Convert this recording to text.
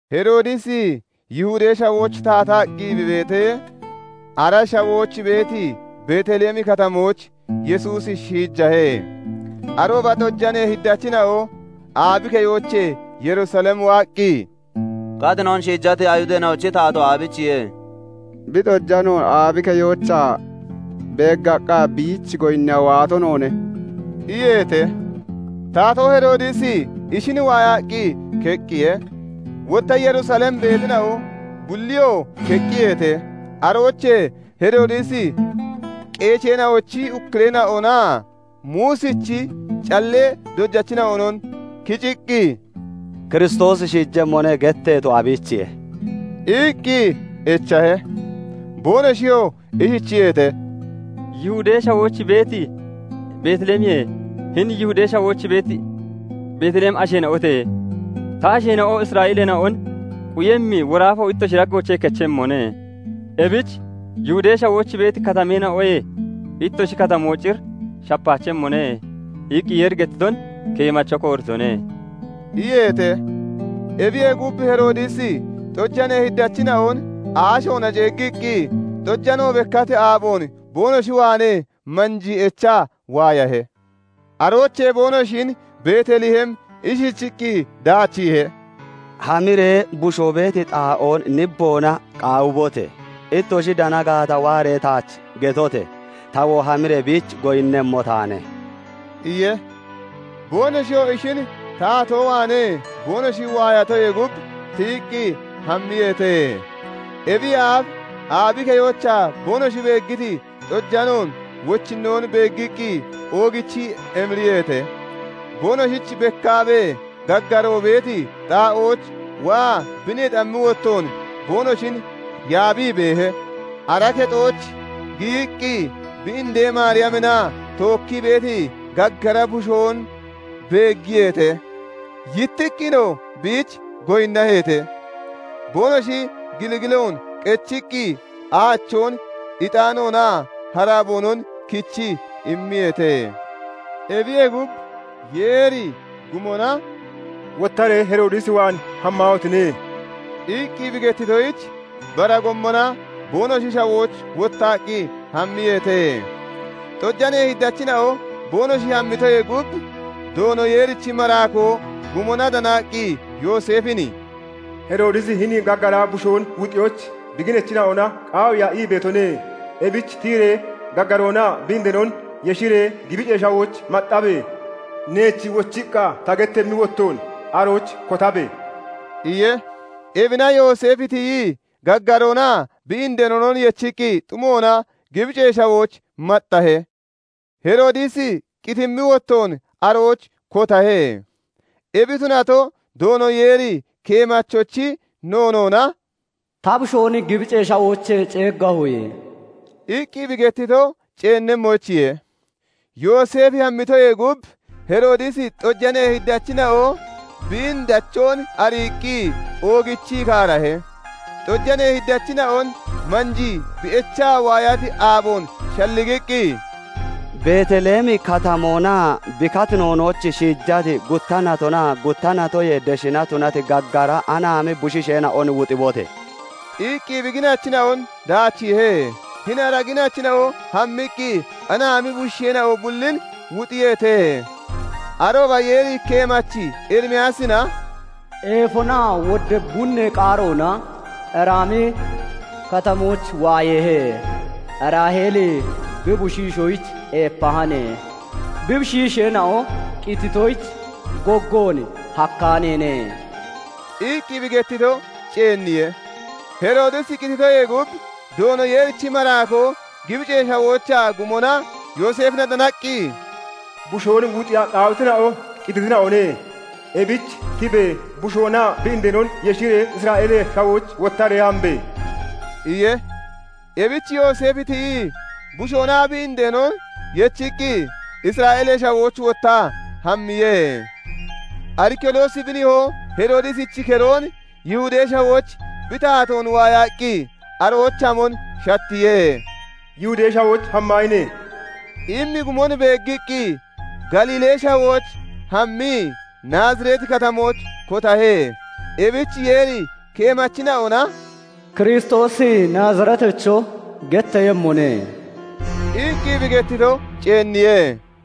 Heroodisi Yihudee Shawooch taataqqi bi beetee, ara shawooch beeti Beet Lehemi Katamooch Yesuusi shiijahe. Arooba xojanee Hiddachina'o aabi keyoochee Yerusalem waaqqi, "Katinoon shiijati Ayihudeena'ochi taatoo aabiichiye? Bi xojanoon aabi keyoochaa beeggaqqa, biich goyinniya waato noone" iyeete. Taatoo Heroodisi ishin waayaqqi keqqiye; wotta Yerusalem beetina'o bulliyoo keqqiyeete. Aroochee Heroodisi qeesheena'ochi ukkureena'onaa Muusichi callee dojachina'onon kiciqqi, " 'Kiristoosi shiijemmone' getteeto, aabiichiye? iqqi echahe. Boonoshiyoo ishichiyeete:- "Yihudee Shawooch beeti Beet Lehemiye; 'Hini Yihudee Shawooch beeti Beet Lehemi asheena'ote; ta asheena'o Isra'eeleena'on quyemmi woraafo ittoshi daggoochee kechemmone; ebich Yihudee Shawooch beeti katameena'oyee ittoshi katamo cir shapaachemmone' iqqi Yeeri gettiton keemacho kooritone" iyeete. Ebiyee gub, Heroodisi xojanee Hiddachina'on aashoona ceeggiiqqi xojano bekkati aaboon boonoshi waanee manjii echaa waayahe. Aroochee boonoshin Beet Lehem ishichiqqi daachiihe:- "Hamiree bushoo beeti xaa'oon nibboona qaawibote! Ittoshi dana gaata, waaree taach getote! Tawoo hamiree biich goyinnemmo taane" iye. Boonoshiyoo ishin taatoo waanee boonoshi waayatoyee gub, tiyiqqi hammiyeete. Ebiyee aaf aabi keyoochaa boonoshi beeggiti xojanoon wochinnoon beeggiqqi oogichii emiriyeete; boonoshich bekkaabee gaggaroo beeti xaa'ooch waa bi neexammi wottoon boonoshin yaabii beehe. Ara kexooch giyiqqi bi indee Maariyaminna tookkii beeti gaggara bushoon beeggiyeete. Yittiqqinoo biich goyinnaheete; boonoshi gilgiloon qechiqqi aachoon, ixaanoonaa haraboonon kichii immiyeete. Ebiyee gub, Yeeri gumona "Wottaree Heroodis waan hammaahotine!" iqqi bi gettitoyich, bara gommona boonoshi shawooch wottaqqi hammiyeete. Xojanee Hiddachina'o boonoshi hammitoyee gub, Doono Yeerichi maraakoo gumona danaqqi, Yooseefin "Heroodisi hini gaggara bushoon wuxiyoyich bi ginachina'ona qaawiiya ii beetone; ebich tiyiree gaggaroonaa bi indeenon yeshiree, Gibicee Shawooch maxxabe! Neech wochiqqa ta gettammi wottoon, arooch kotabe!" iye. Ebina Yooseefi tiyii gaggaroonaa bi indeenon yechiqqi, xumoona Gibicee Shawooch maxxahe; Heroodisi qitimmi wottoon arooch kotahe. Ebi tunato, Doono Yeeri keemachochi noonoona, "Ta Bushoon Gibicee Shawoochee ceeggahoye" iqqi bi gettito ceennemmoyichiye. Yooseefi hammitoyee gub, Heroodisi xojanee Hiddachina'o biin dachoon ariiqqi oogichii kaarahe; xojanee Hiddachina'on manjii bi echaa waayati aaboon shalligiqqi, "Beet Lehemi Katamoonaa bi katinoonooch shiijati, gutta natonaa gutta natoyee deshina tunati gaggara anaami bushiisheena'on wuxibote!" iqqi bi ginachina'on daachiihe. Hini ara ginachina'o hammiqqi, anaami bushiisheena'o bullin wuxiyeete. Arooba Yeeri keemachi Erimiyaasina "Eefonaa wodda bunnee qaaroona Raami Katamooch waayeehe; Raaheeli bi bushiishoyich eepahane; Bi bushiisheena'o qititoyich, goggoon hakkaaneene" iqqi bi gettito ceenniye. Heroodisi qititoyee gub, Doono Yeerichi maraakoo Gibicee Shawoochaa gumona Yooseefina danaqqi, "Bushoon wuxiya qaawitina'o qititina'one. Ebich tibe! Bushoonaa bi indeenon yeshiree Isra'eelee Shawooch wottaree hambe!" iye. Ebich Yooseefi tiyii bushoonaa bi indeenon yechiqqi Isra'eelee Shawooch wottaa hammiye. Arikiloosi bi nihoo Heroodisichi keroon Yihudee Shawooch bi taatoon waayaqqi, arooch hamon shattiye; "Yihudee Shawooch hammahine!" immi gumon beeggiqqi Galiilee Shawooch hammii, Naazireeti katamooch kotahe. Ebich Yeeri keemachina'ona "Kiristoosi Naazireetacho getteeyemmone" iqqi bi gettito ceenniye.